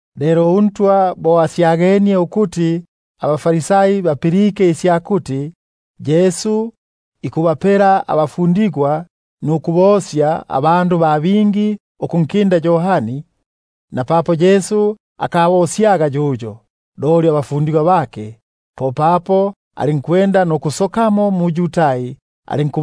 Lelo uNtwa bo asyagenie ukuti abaFarisai bapilike isya kuti Yesu ikubapela bafundigwa nukubosya abandu ba bingi ukunkinda Yohani, — napapo Yesu akabosyaga yuyo, loli abafundigwa bake — popapo alinkusoka mu-Yudai, alinku-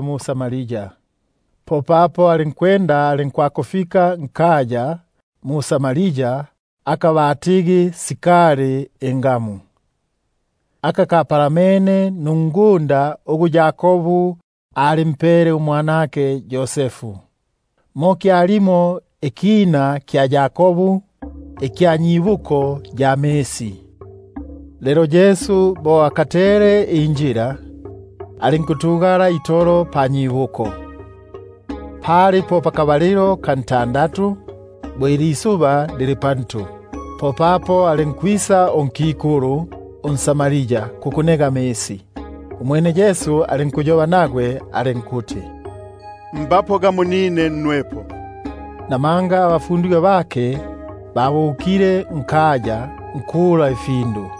mu-Samaria. Popapo alinkwakufika nkaya ka Samaria aka batigi Sikari, aka kapalamene nungunda ugu Yakobu alimpele umwanake Yosefu. Mo kyalimo ikina kya Yakobu ikya nyibuko ya misi. Lelo Yesu bo akatele injila, alinkutugala itolo panyibuko; pali po pakabalilo ka ntandatu.#Ko kuti ilisuba bo lili pantu. Popapo alinkwisa unkikulu unSamaria kukunega amisi. Umwene Yesu alinkumbula alinkuti: Mbapo nine nnwepo. Namanga abafundigwa bake babukile nkaya nkula ifyakulya.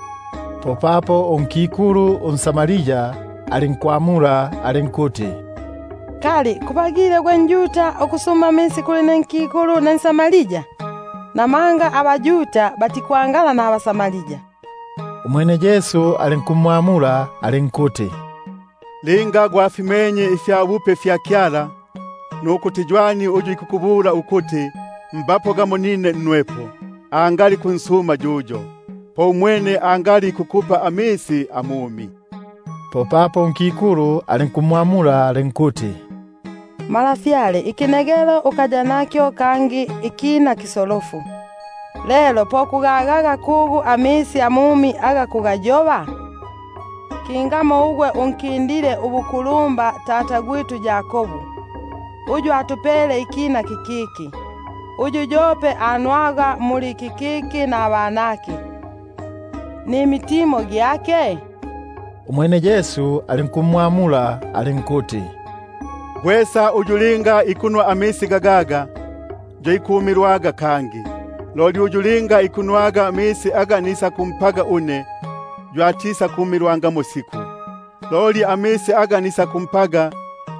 Popapo unkikulu unSamaria alinkumbula alinkuti: Kali ubagile gwe njuda ukusuma amisi kuli ne nkikulu ne nSamaria? (Namanga abaYuda batikwangala nabaSamaria). Umwene Yesu alinkumwamula alinkuti: Linga gwalimenye ifyabupe fya Kyala, nukuti ywani uyu ikukubula ukuti, mbapo nine nnwepo, angali kunsuma yuyo, po umwene angali ikukupa amisi amumi. Popapo unkikulu alinkumwamula alinkuti: Malafyale, ikinegelo ukaya nakyo, kangi ikina kiso- lofu, lelo po kugagaga kugu amisi amumi? Kingamo unkindile ubukulumba tata Yakobu, uyu atupele ikina kikiki, uyu yope anwaga muli kikiki, nabanake, nimitimo gyake? Umwene Yesu alinkumwamula alinkuti: Gwesa uyu linga ikunwa amisi gagaga, yo ikumilwaga kangi; loli uyu linga ikunwa amisi aga nisakumpaga une, yo atisakukibonaga siku ikyumilwa, loli amisi aga nisakumpaga,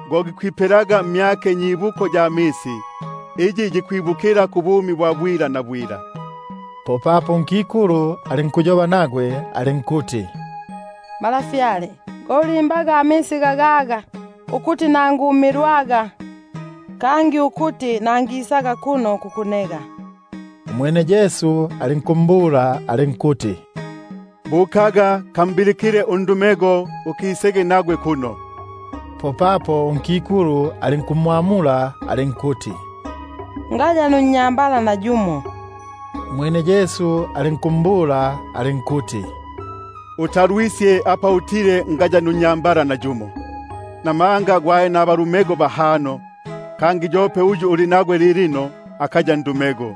go gikwipelaga mmyake nyibuko ya misi, iyi yikwibukila kubumi bwa bwila bwila. Popapo unkikulu alinkuyoba nagwe alinkuti: Malafyale, go ulimbaga amisi gagaga, ukuti nangumilwaga, kangi ukuti nangisaga kuno kukunega. Umwene alinkumbula alinkuti: Buka kambilikile undumego, mukisege kuno. Popapo unkikulu alinkumwamula alinkuti: Ngaya nunnyambala. Umwene Yesu alinkumbula alinkuti: Utalwisye apa utile ngaya nunnyambala; buno gwali nabanyambala bahano, kangi uyu uli nagwe lilino akaya ndumego.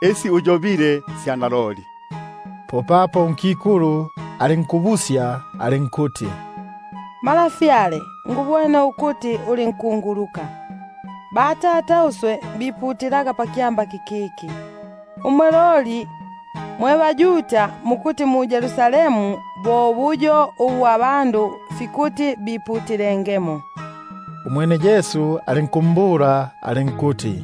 Isi uyobile sya naloli. Popapo unkikulu alinkumbula alinkuti: Ngubwene ukuti uli nkunguluka. Batata biputilaga nkyamba kikiki, umwe loli mukuti mu-Yerusalemu bo buyo ubu abandu fikuti biputilengemo. Umwene Yesu alinkumbula alinkuti: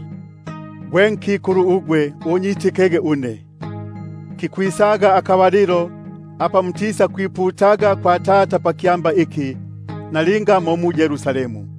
Unyitikege une gwe nkikulu, kikwisaga akabalilo apa mutisakwiputilaga kwa Tata nkyamba iki, nalinga mo mu-Yerusalemu.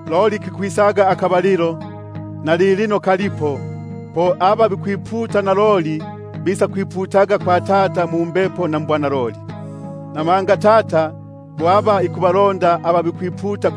Loli kikwisaga akabalilo, nalilino kalipo, po aba bikwiputa naloli bisakwiputaga kwa Tata mumbepo na mbwanaloli; namanga Tata ikubalonda aba bikwiputa bo bunobuno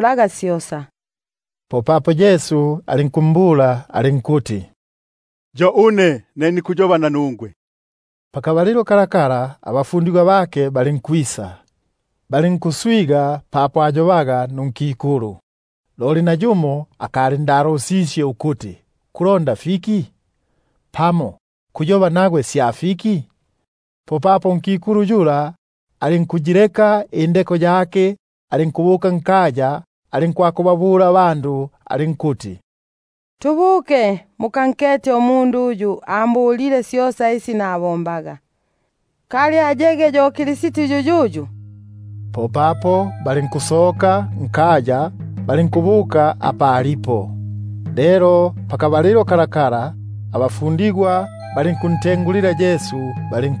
laga syosa. Popapo Yesu alinkumbula alinkuti: Yo une ne nikuyoba nanungwe. Pakabalilo kako abafundigwa bake balinkwisa, balinkuswiga papo ayobaga nunkikulu; loli pope nayumo akalindalusisye ukuti: Kulonda fiki? pamo, kuyoba nagwe sya fiki? Popapo unkikulu alinkuyileka papo indeko yake, alinkubuka nkaya, alinkubabula abandu alinkuti: Tubuke, mukankete umundu uyu ambulile syosa isi nabombaga; kali ayege yo Kristi yuyuyu? Popapo balinkusoka nkaya, balinkubuka apa alipo. Lelo pakabalilo kako, abafundigwa balinkuntengulila bali-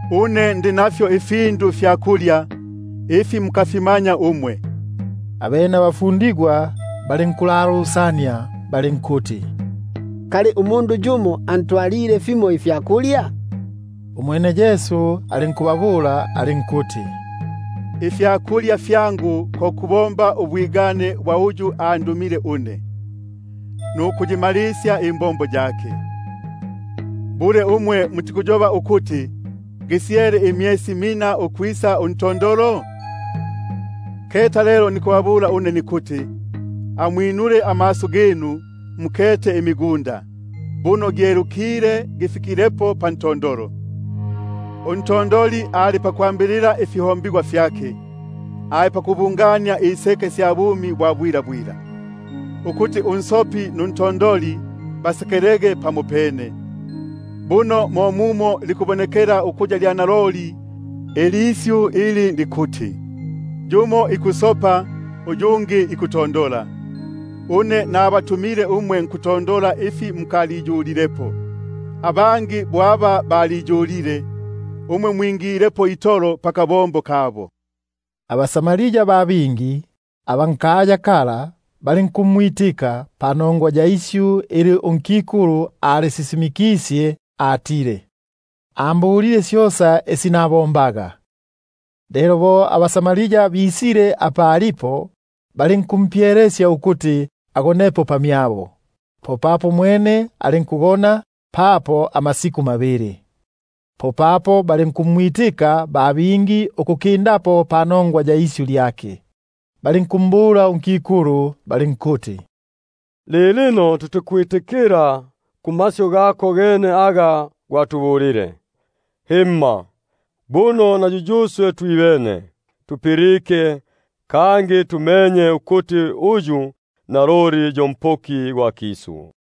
Une ndi nafyo ifyakulya ifi mukalimanya umwe. Abene abafundigwa balinkulalusania balinkuti: Kali yumo umundu antwalile fimo ifyakulya? Umwene Yesu alinkubabula alinkuti: Ifyakulya fyangu ko kubomba ubwigane bwa uyu andumile une, nukuyimalisya imbombo yake. Umwe mutikuyoba ukuti: Gisyele imyesi mina ukwisa untondolo? Keta lelo nikubabula nikuti: Amwinulege amaso ginu mukete imigunda, buno gyelukile gifikilepo pantondolo. Untondoli ikwambilila ifihombigwa fyake, ali pakubungania iseke sya bumi bwa bwila; ukuti unsopi nuntondoli basekelege pamo- pene. Buno mo mumo likubonekela ukuya lya naloli ilisyu ili likuti: Yumo ikusopa, uyungi ikutondola. Une nabatumile nkutondola ifi mukaliyulilepo; abangi baliyulile, umwe mwingilepo itolo pakabombo kabo. AbaSamaria ba bingi aba nkaya kala balinkumwitika, panongwa ya isyu ili unkikulu alisisimikisye atile: Ambulile syosa isi nabombaga. Lelo bo abaSamaria bafikile apa alipo, balinkumpyelesya ukuti agonepo pamyabo. Umwene alinku- gona papo amasiku mabili. Popapo balinkumwitika ba bingi ukukindapo, panongwa ya isyu lyake; balinkumbula unkikulu balinkuti: Lilino mukwitikila pamasyu gako gene, himma, buno na yuyuswe twibene tupilike, kangi tumenye ukuti uyu naloli yo Mpoki gwa kisu.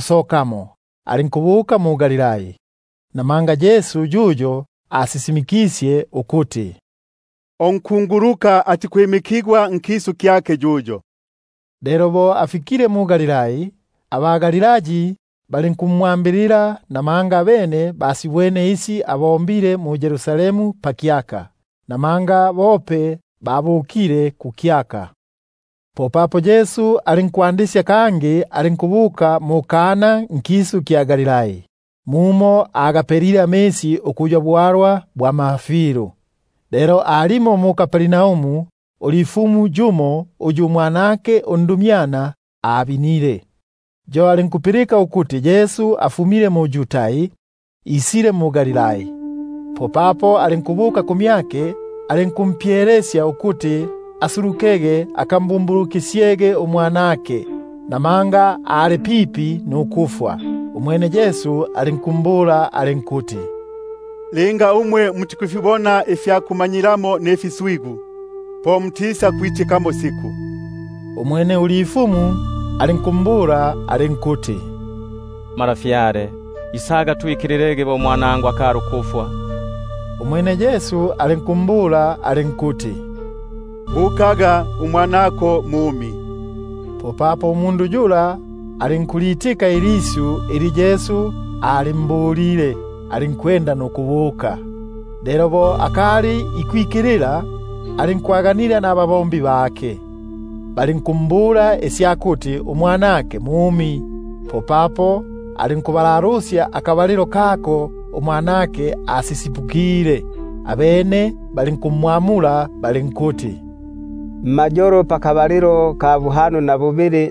sokamo, alinkubuka mu-Galilai. Namanga Yesu yuyo asisimikisye ukuti: Unkunguluka atikwimikigwa nkisu kyake. Lelo bo afikile mu-Galilai, abaGalilai balinkumwambilila; abene basibwene syosa isi asibombile mu-Yerusalemu pakyaka, namanga bope babukile kukyaka. Popapo alinkwisa kangi mu-Kana nkisu kya Galilai, mumo agapelile amisi ukuya bwalwa bwa mafilu. Lelo aliko ulifumu yumo uyu umwanake ali mbine mu-Kapernaumu. Umwene bo apilike ukuti Yesu afumile mu-Yudai, isile mu-Galilai, alinkubuka kumyake alinkumpyelesya ukuti asuluke akambumbulusyege umwanake; namanga ali pipi itolo ukufwa. Umwene Yesu alinkumbula alinkuti: Linga mutikufibona ifya kumanyilamo mfiswigu, po mutikwitikamo siku. Umwene ulifumu alinkumbula alinkuti: Malafyale, isaga twikililege bo umwanangu akali ukufwa. Umwene Yesu alinkumbula alinkuti: Bukaga, umwanako mumi. Popapo umundu yula alinkulitika ilisyu ili Yesu alimbulile, alinkubuka. Lelo bo akali ikwikilila, abatumwa bake balinkwaganila nagwe, bali- nkumbala isya kuti umwanake mumi. Popapo alinkubalalusya akabalilo kako umwanake asisipukile; abene balinkumbula balinkuti: Mmayolo pakabalilo ka buhano na bubili,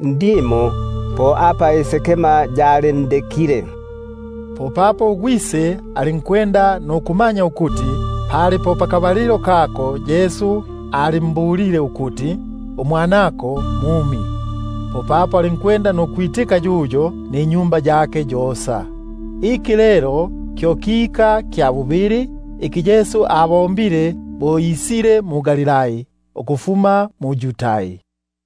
po apa isekema yalindekile. Popapo ugwise alinkumanya ukuti pali po pakabalilo kako Yesu alimbulile ukuti: Umwanako mumi; popapo alinkwitika yuyo ninyumba yake yosa. Iki lelo kyo kika kya bubili, iki Yesu abombile bo isile mu-Galilai, ukufuma mu-Yudai.